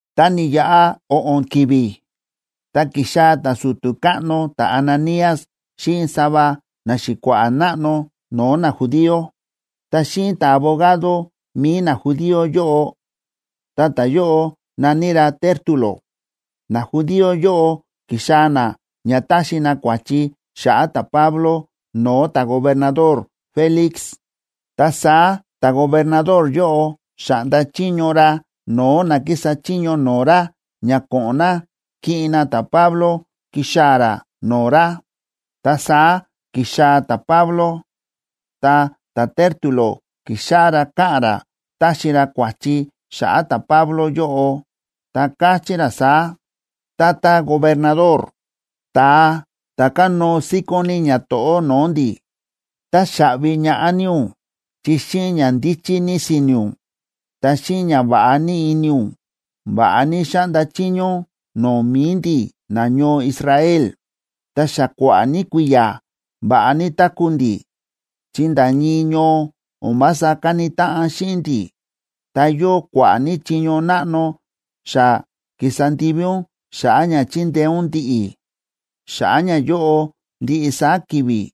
Tá ni̱yaꞌa o̱ꞌo̱n ki̱vi̱, ta ki̱xaa̱ ta̱su̱tu̱ káꞌno ta̱Ananías xíꞌin sava naxi̱kua̱ꞌa̱ náꞌno no̱o̱ najudío, ta xíꞌin ta̱abogado mi̱i najudío yóꞌo, ta ta̱yóꞌo na̱ní ra Tértulo. Najudío yóꞌo ki̱xaa̱ na ña taxi na kua̱chi xa̱ꞌa̱ ta̱Pablo no̱o̱ ta̱gobernador Félix. Ta saá ta̱gobernador yóꞌo xa̱ꞌnda chiño ra no̱o̱ na kísa chiño no̱o̱ ra ña ko̱ꞌo̱n na kiꞌin na ta̱Pablo kixaa̱ ra no̱o̱ ra. Ta saá ki̱xaa̱ ta̱Pablo, ta ta̱Tértulo ki̱xáꞌá ra káꞌa̱n ra táxi ra kua̱chi xa̱ꞌa̱ ta̱Pablo yóꞌo, ta káchí ra saá: ―Tata gobernador, ta̱a ta̱ kánóo síkón ní ñato̱ꞌó no̱o̱ ndi̱, táxaꞌvi ñaꞌá ní ún chi xíꞌin ña ndíchí ní si̱ni̱ ún, ta xíꞌin ñava̱ꞌa ní ini ún, va̱ꞌa ní xáꞌnda chiño ún no̱o̱ mi̱i ndi̱ nañoo Israel, ta xa kua̱ꞌa̱ ní kui̱ya̱ va̱ꞌa ní táku̱ ndi̱, chi nda̱ ñii ñoo o̱n vása káni táꞌan xíꞌin ndi̱. Ta yóo kua̱ꞌa̱ ní chiño náꞌno xa ki̱sa ndivi ún xa̱ꞌa̱ ña chi̱ndeé ún ndi̱ꞌi̱. Xa̱ꞌa̱ ñayóꞌo ndiꞌi saá ki̱vi̱,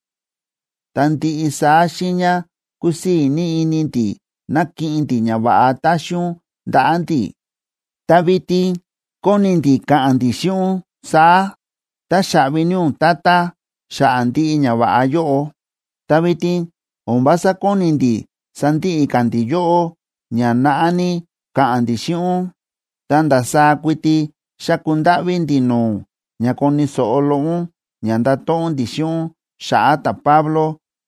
ta ndiꞌi saá xiiña kúsii̱ ní ini ndi̱ na̱kiꞌin ndi̱ ñava̱ꞌa ta̱xi ún ndaꞌa̱ ndi̱, ta vitin kóni ndi̱ ka̱ꞌa̱n ndi̱ xíꞌin ún saá: “Táxaꞌvi ní ún, tata, xa̱ꞌa̱ ndiꞌi ñava̱ꞌa yóꞌo.” Ta vitin o̱n vása kóni ndi̱ sandiꞌi ka̱ ndi̱ yóꞌó ña naꞌá ní ka̱ꞌa̱n ndi̱ xíꞌin ún. Ta ndasaá kuiti xáku ndáꞌví ndi̱ no̱o̱ ún ña koni̱ so̱ꞌo loꞌo ún ña ndato̱ꞌon ndi̱ xíꞌin ún xa̱ꞌa̱ ta̱Pablo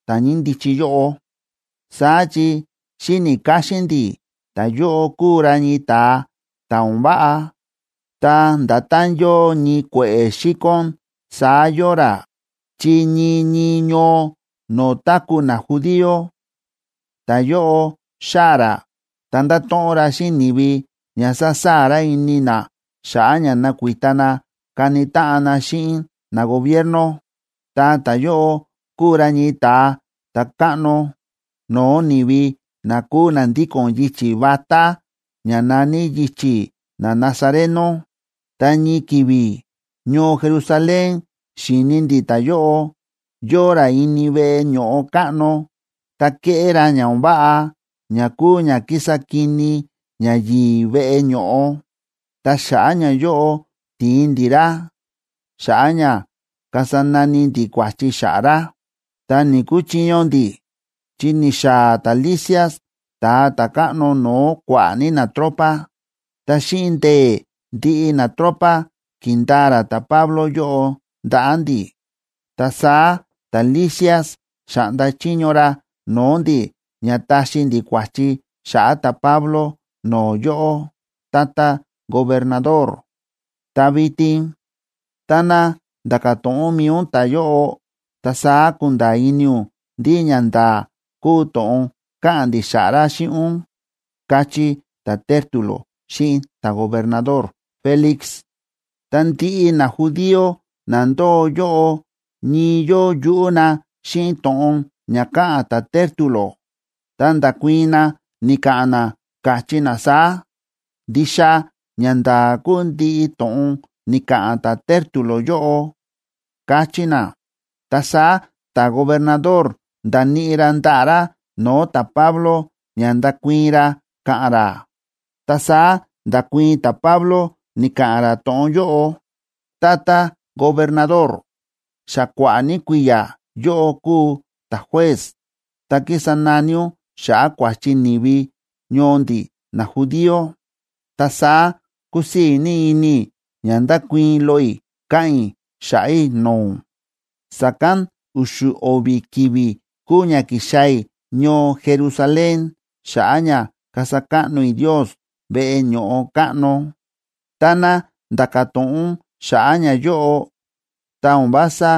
ta̱ ñíndichi yóꞌo. Saá chi xíni̱ káxín ndi̱ ta̱yóꞌo kúu ra ñii ta̱a ta̱ o̱n váꞌa, ta nda̱tán yóo ñii kue̱ꞌe̱ xíkón saá yóo ra, chi ñii ñii ñoo no̱o̱ táku̱ najudío, ta̱yóꞌo xáa̱ ra ta ndáto̱ꞌon ra xíꞌin ni̱vi ña sásaa̱ ra ini na xa̱ꞌa̱ ña nakuita na kani táꞌan na xíꞌin nagobierno. Ta ta̱yóꞌo kúu ra ñii ta̱a ta̱káꞌno no̱o̱ ni̱vi na kúu na ndíko̱n yichi̱ vatá ña na̱ní yichi̱ nanazareno. Ta ñii ki̱vi̱ ñoo Jerusalén xi̱ni ndi̱ ta̱yóꞌo, yóo ra ini veꞌe ño̱ꞌo káꞌno, ta kéꞌé ra ña o̱n váꞌa ña kúu ña kísa kini ñayi̱i̱ veꞌe ño̱ꞌo. Ta xa̱ꞌa̱ ñayóꞌo, ti̱in ndi̱ ra xa̱ꞌa̱ ña kasa nani ndi̱ kua̱chi xa̱ꞌa̱ ra, ta ni̱‑kuchiño ndi̱, chi ni̱xaa̱ ta̱Lisias ta̱a ta̱káꞌno no̱o̱ kua̱ꞌa̱ ní natropa, ta xíꞌin ndee̱ ndiꞌi natropa, ki̱ndaa ra ta̱Pablo yóꞌo ndaꞌa̱ ndi̱. Ta saá ta̱Lisias xa̱ꞌnda chiño ra no̱o̱ ndi̱ ña taxi ndi̱ kua̱chi xa̱ꞌa̱ ta̱Pablo no̱o̱ yóꞌó, tata gobernador. Ta vitin táná nda̱ka̱ to̱ꞌon mi̱i ún ta̱yóꞌo, ta saá kunda̱a̱ ini ún ndí ñanda̱a̱ kúu to̱ꞌon káꞌa̱n ndi̱ xa̱ꞌa̱ ra xíꞌin ún ―káchí ta̱Tértulo xíꞌin ta̱gobernador Félix. Ta ndiꞌi najudío na ndóo yóꞌo ñii yóo yuꞌú na xíꞌin to̱ꞌon ña káꞌa̱n ta̱Tértulo, ta nda̱kuii̱n na, ni̱ka̱ꞌa̱n na, káchí na saá: ―Ndixa ñanda̱a̱ kúu ndiꞌi to̱ꞌon ni̱ka̱ꞌa̱n ta̱Tértulo yóꞌo ―káchí na. Ta saá ta̱gobernador nda̱níꞌi ra ndaꞌa̱ ra no̱o̱ ta̱Pablo ña ndakuii̱n ra ka̱ꞌa̱n ra. Ta saá nda̱kuii̱n ta̱Pablo, ni̱ka̱ꞌa̱n ra to̱ꞌon yóꞌo: ―Tata gobernador, xa kua̱ꞌa̱ ní kui̱ya̱ yóꞌó kúu ta̱juez, ta kísa nani ún xa̱ꞌa̱ kua̱chi ni̱vi ñoo ndi̱ najudío. Ta saá kúsii̱ ní ini i̱ ña ndakuii̱n loꞌo i̱ ka̱ꞌa̱n i̱ xa̱ꞌa̱ i̱ no̱o̱ ún. Sa̱kán u̱xu̱ o̱vi̱ ki̱vi̱ kúu ña ki̱xaa̱ i̱ ñoo Jerusalén xa̱ꞌa̱ ña kasa káꞌno i̱ Ndios veꞌe ño̱ꞌo káꞌno. Táná nda̱ka̱ to̱ꞌon ún xa̱ꞌa̱ ñayóꞌo, ta o̱n vása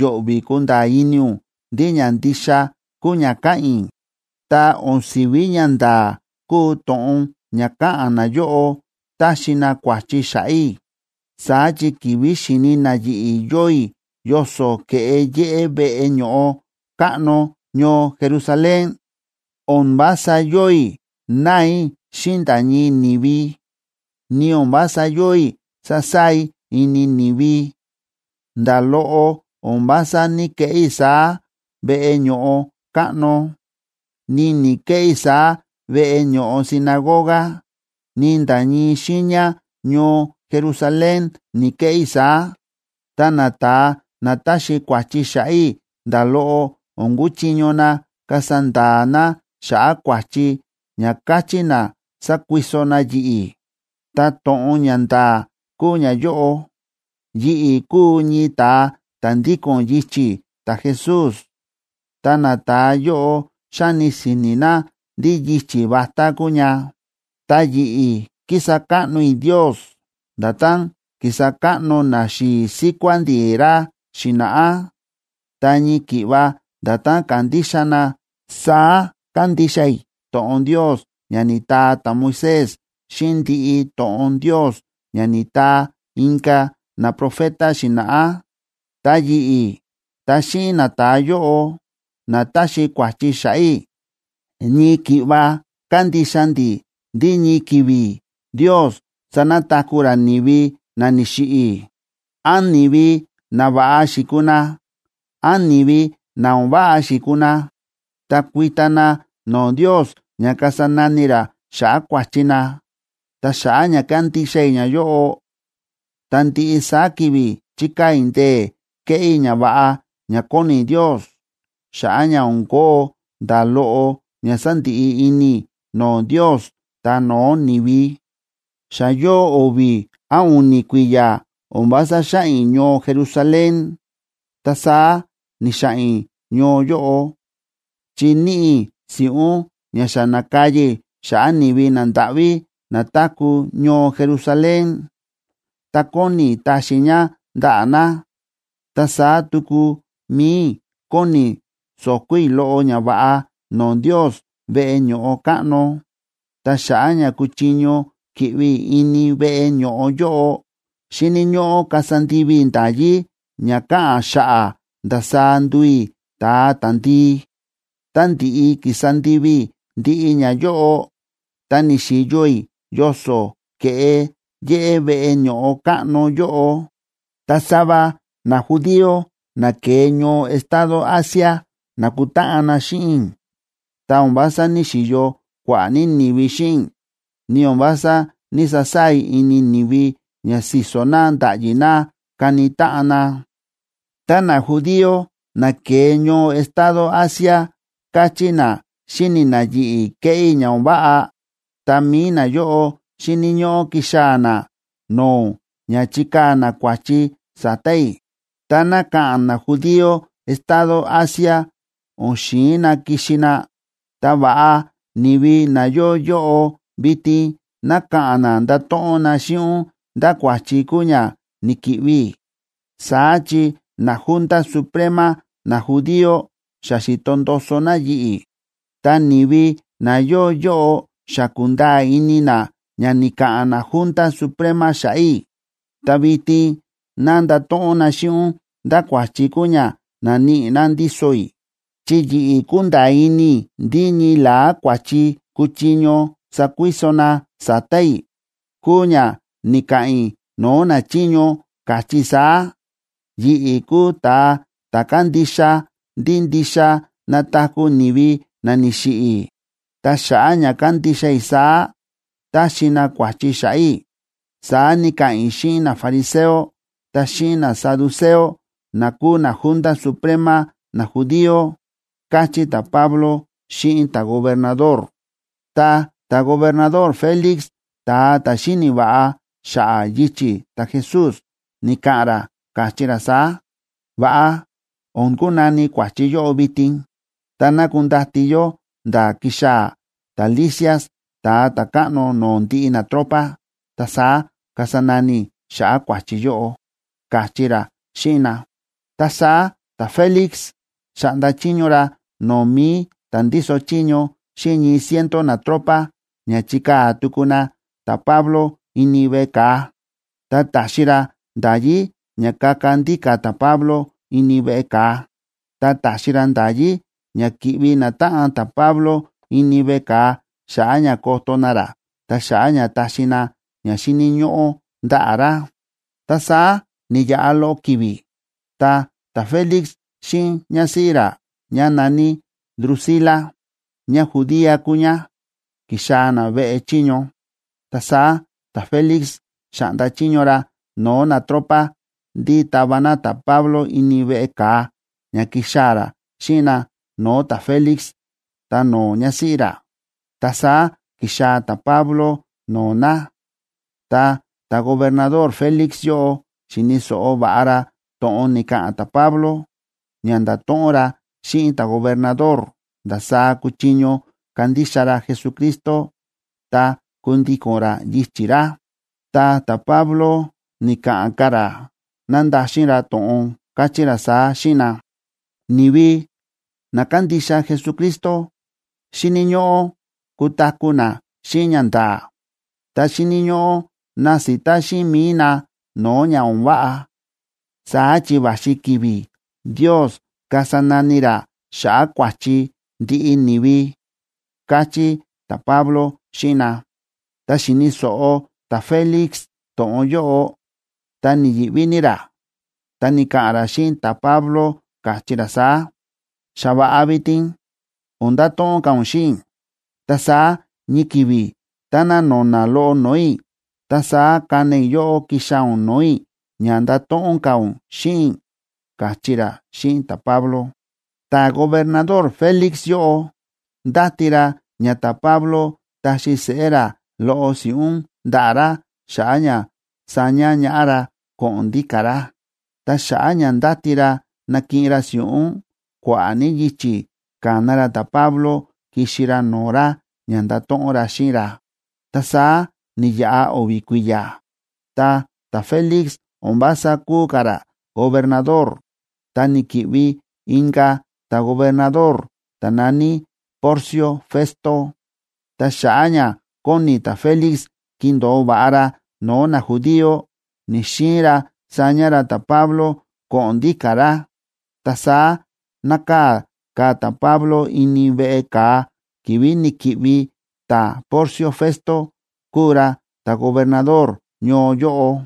yo̱ꞌvi̱ kunda̱a̱ ini ún ndí ña ndixa kúu ña káꞌa̱n i̱. Ta o̱n si̱ví ñanda̱a̱ kúu to̱ꞌon ña káꞌa̱n nayóꞌo, táxi na kua̱chi xa̱ꞌa̱ i̱. Saá chi ki̱vi̱ xi̱ni na yi̱ꞌi̱ yóo i̱ yoso̱ ke̱ꞌe yéꞌé veꞌe ño̱ꞌo káꞌno ñoo Jerusalén, o̱n vása yóo i̱ náa i̱ xíꞌin nda̱ ñii ni̱vi, ni o̱n vása yóo i̱ sásaa̱ i̱ ini ni̱vi. Nda̱ loꞌo o̱n vása ní‑keꞌé i̱ saá veꞌe ño̱ꞌo káꞌno, ni ni̱‑keꞌé i̱ saá veꞌe ño̱ꞌo sinagoga, ni nda̱ ñii xiiña ñoo Jerusalén ni̱‑keꞌé i̱ saá. Ta nata̱a na táxi kua̱chi xa̱ꞌa̱ i̱ nda̱ loꞌo o̱n kúchiño na kasa nda̱a̱ na xa̱ꞌa̱ kua̱chi ña káchí na sákuiso na yi̱ꞌi̱. Ta to̱ꞌon ña nda̱a̱ kúu ñayóꞌo: yi̱ꞌi̱ kúu ñii ta̱a ta̱ ndíko̱n yichi̱ ta̱Jesús, ta nata̱a yóꞌo xáni si̱ni̱ na ndí yichi̱ vatá kúu ña. Ta yi̱ꞌi̱ kísa káꞌno i̱ Ndios nda̱tán ki̱sa káꞌno naxi̱i̱ síkuá ndi̱ ra xi̱na̱ꞌá. Ta ñii ki̱ꞌva nda̱tán ka̱ndixa na, saá kándixa i̱ to̱ꞌon Ndios ña ni̱taa ta̱Moisés xíꞌin ndiꞌi to̱ꞌon Ndios ña ni̱taa inka̱ naprofeta xi̱na̱ꞌá. Ta yi̱ꞌi̱ ta xíꞌin nata̱a yóꞌo na táxi kua̱chi xa̱ꞌa̱ i̱, ñii ki̱ꞌva kándixa ndi̱ ndí ñii ki̱vi̱ Ndios sanataku̱ ra ni̱vi na ni̱xiꞌi̱, án ni̱vi nava̱ꞌa xi̱kuu na, án ni̱vi na o̱n váꞌa xi̱kuu na, ta kuita na no̱o̱ Ndios ña kasa nani ra xa̱ꞌa̱ kua̱chi na. Ta xa̱ꞌa̱ ña kándixa i̱ ñayóꞌo, ta ndiꞌi saá ki̱vi̱ chíkaa̱ i̱ ndee̱ keꞌé i̱ ñava̱ꞌa ña kóni Ndios xa̱ꞌa̱ ña o̱n kóo nda̱ loꞌo ña sandiꞌi ini i̱ no̱o̱ Ndios ta no̱o̱ ni̱vi. ’Xa yóo o̱vi̱ án u̱ni̱ kui̱ya̱ o̱n vása xáꞌa̱n i̱ ñoo Jerusalén, ta saá ni̱xa̱ꞌa̱n i̱ ñoo yóꞌo, chi níꞌi i̱ si̱ꞌún ña xa na̱kaya i̱ xa̱ꞌa̱ ni̱vi nandáꞌví na táku̱ ñoo Jerusalén, ta kóni i̱ taxi i̱ ña ndaꞌa̱ na. Ta saá tuku mi̱i i̱ kóni i̱ so̱ko̱ i̱ loꞌo ñava̱ꞌa no̱o̱ Ndios veꞌe ño̱ꞌo káꞌno. Ta xa̱ꞌa̱ ña kuchiño ki̱ꞌvi i̱ ini veꞌe ño̱ꞌo yóꞌo, xíni̱ ñóꞌó kasa ndivi i̱ nda̱yí ña káꞌa̱n xa̱ꞌa̱ ndasaá nduu i̱ ta̱a ta̱ndii. Tá ndi̱ꞌi ki̱sa ndivi i̱ ndiꞌi ñayóꞌo, ta ni̱xi̱yo i̱ yoso̱ ke̱ꞌe yéꞌé veꞌe ño̱ꞌo káꞌno yóꞌo, ta sava najudío na ke̱e ñoo estado Asia na̱kutáꞌan na xíꞌin i̱. Ta o̱n vása ní‑xiyo kua̱ꞌa̱ ní ni̱vi xíꞌin i̱, ni o̱n vása ní‑sasaa̱ i̱ ini ni̱vi ña si̱so̱ na nda̱ꞌyi na kani táꞌan na. Tá najudío na ke̱e ñoo estado Asia káchí na xi̱ni na yi̱ꞌi̱ kéꞌé i̱ ña o̱n váꞌa, ta mi̱i nayóꞌo xíni̱ ñóꞌó kixaa̱ na no̱o̱ ún ña chikaa̱ na kua̱chi sa̱ta̱ i̱. Táná ka̱ꞌa̱n najudío estado Asia o̱n xi̱in na kixi na, ta va̱ꞌa ni̱vi na yóo yóꞌo vitin ná ka̱ꞌa̱n na ndato̱ꞌon na xíꞌin ún ndá kua̱chi kúu ña ni̱ki̱ꞌvi i̱. Saá chi naJunta Suprema najudío xa xi̱to ndoso na yi̱ꞌi̱, ta ni̱vi na yóo yóꞌo xa kúnda̱a̱ ini na ña ni̱ka̱ꞌa̱n naJunta Suprema xa̱ꞌa̱ i̱. Ta vitin ná ndato̱ꞌon na xíꞌin ún ndá kua̱chi kúu ña na̱níꞌi na ndíso i̱. Chi yi̱ꞌi̱ kúnda̱a̱ ini i̱ ndí ñii la̱á kua̱chi kuchiño sakuiso na sa̱ta̱ i̱ kúu ña ni̱ka̱ꞌa̱n i̱ no̱o̱ nachiño, káchí i̱ saá: “Yi̱ꞌi̱ kúu ta̱a ta̱ kándixa ndí ndixa nataku̱ ni̱vi na ni̱xiꞌi̱. Ta xa̱ꞌa̱ ña kándixa i̱ saá, táxi na kua̱chi xa̱ꞌa̱ i̱”, saá ni̱ka̱ꞌa̱n i̱ xíꞌin nafariseo ta xíꞌin nasaduceo na kúu naJunta Suprema najudío ―káchí ta̱Pablo xíꞌin ta̱gobernador. Ta ta̱gobernador Félix, ta̱a ta̱ xíni̱ va̱ꞌa xa̱ꞌa̱ yichi̱ ta̱Jesús, ni̱ka̱ꞌa̱n ra, káchí ra saá: ―Va̱ꞌa o̱n kunani kua̱chi yóꞌo vitin, ta ná kundati yó nda̱ kixaa̱ ta̱Lisias ta̱a ta̱káꞌno no̱o̱ ndiꞌi natropa, ta saá kasa nani i̱ xa̱ꞌa̱ kua̱chi yóꞌo ―káchí ra xíꞌin na. Ta saá ta̱Félix xa̱ꞌnda chiño ra no̱o̱ mi̱i ta̱ ndíso chiño xíꞌin ñii ciento natropa ña chikaa̱ tuku na ta̱Pablo ini veꞌe ka̱a, ta ta̱xi ra nda̱yí ña kaka ndíka̱ ta̱Pablo ini veꞌe ka̱a, ta ta̱xi ra nda̱yí ña ki̱ꞌvi natáꞌan ta̱Pablo ini veꞌe ka̱a xa̱ꞌa̱ ña koto na ra ta xa̱ꞌa̱ ña taxi na ña xíni̱ ñóꞌó ndaꞌa̱ ra. Ta saá ni̱yaꞌa loꞌo ki̱vi̱, ta ta̱Félix xíꞌin ñásíꞌí ra, ñá na̱ní Drusila, ñájudía kúu ñá, ki̱xaa̱ na veꞌe chiño. Ta saá ta̱Félix xa̱ꞌnda chiño ra no̱o̱ natropa ndí tava na ta̱Pablo ini veꞌe ka̱a ña kixaa̱ ra xíꞌin na no̱o̱ ta̱Félix ta no̱o̱ ñásíꞌí ra. Ta saá ki̱xaa̱ ta̱Pablo no̱o̱ na, ta ta̱gobernador Félix yóꞌo xi̱ni̱ so̱ꞌo va̱ꞌa ra to̱ꞌon ni̱ka̱ꞌa̱n ta̱Pablo, ña nda̱to̱ꞌon ra xíꞌin ta̱gobernador ndasaá kuchiño kandixa ra Jesucristo ta kundíko̱n ra yichi̱ ra. Ta ta̱Pablo, ni̱ka̱ꞌa̱n ka̱ ra nándaxin ra to̱ꞌon, káchí ra saá xíꞌin na: ―Ni̱vi na kándixa Jesucristo xíni̱ ñóꞌó kutaku̱ na xíꞌin ñanda̱a̱, ta xíni̱ ñóꞌó nasita xíꞌin mi̱i na no̱o̱ ña o̱n váꞌa. Saá chi va̱xi ki̱vi̱ Ndios kasa nani ra xa̱ꞌa̱ kua̱chi ndiꞌi ni̱vi ―káchí ta̱Pablo xíꞌin na. Tá xi̱ni̱ so̱ꞌo ta̱Félix to̱ꞌon yóꞌo, ta ni̱yi̱ꞌví ní ra, ta ni̱ka̱ꞌa̱n ra xíꞌin ta̱Pablo, káchí ra saá: ―Xa va̱ꞌa vitin, o̱n ndato̱ꞌon ka̱ ún xíꞌin i̱. Ta saá ñii ki̱vi̱ táná no̱na̱ loꞌo no̱o̱ i̱, ta saá kana i̱ yóꞌó kixaa̱ ún no̱o̱ i̱ ña ndato̱ꞌon ka̱ ún xíꞌin i̱ ―káchí ra xíꞌin ta̱Pablo. Ta̱gobernador Félix yóꞌo ndáti ra ña ta̱Pablo taxi seꞌé ra loꞌo si̱ꞌún ndaꞌa̱ ra xa̱ꞌa̱ ña saña ñaꞌá ra ko̱ꞌo̱n ndíka̱ ra. Ta xa̱ꞌa̱ ña ndáti ra nakiꞌin ra si̱ꞌún, kua̱ꞌa̱ ní yichi̱ ka̱na ra ta̱Pablo kixi ra no̱o̱ ra ña ndato̱ꞌon ra xíꞌin ra. Ta saá ni̱yaꞌa o̱vi̱ kui̱ya̱, ta ta̱Félix o̱n vása kúu ka̱ ra gobernador, ta ni̱ki̱ꞌvi inka̱ ta̱gobernador ta̱ na̱ní Porcio Festo. Ta xa̱ꞌa̱ ña kóni ta̱Félix kindo̱o va̱ꞌa ra no̱o̱ najudío, ni̱‑xiin ra saña ra ta̱Pablo ko̱ꞌo̱n ndíka̱ ra. Ta saá nákaa̱ ka̱ ta̱Pablo ini veꞌe ka̱a ki̱vi̱ ni̱ki̱ꞌvi ta̱Porcio Festo kuu ra ta̱gobernador ñoo yóꞌo.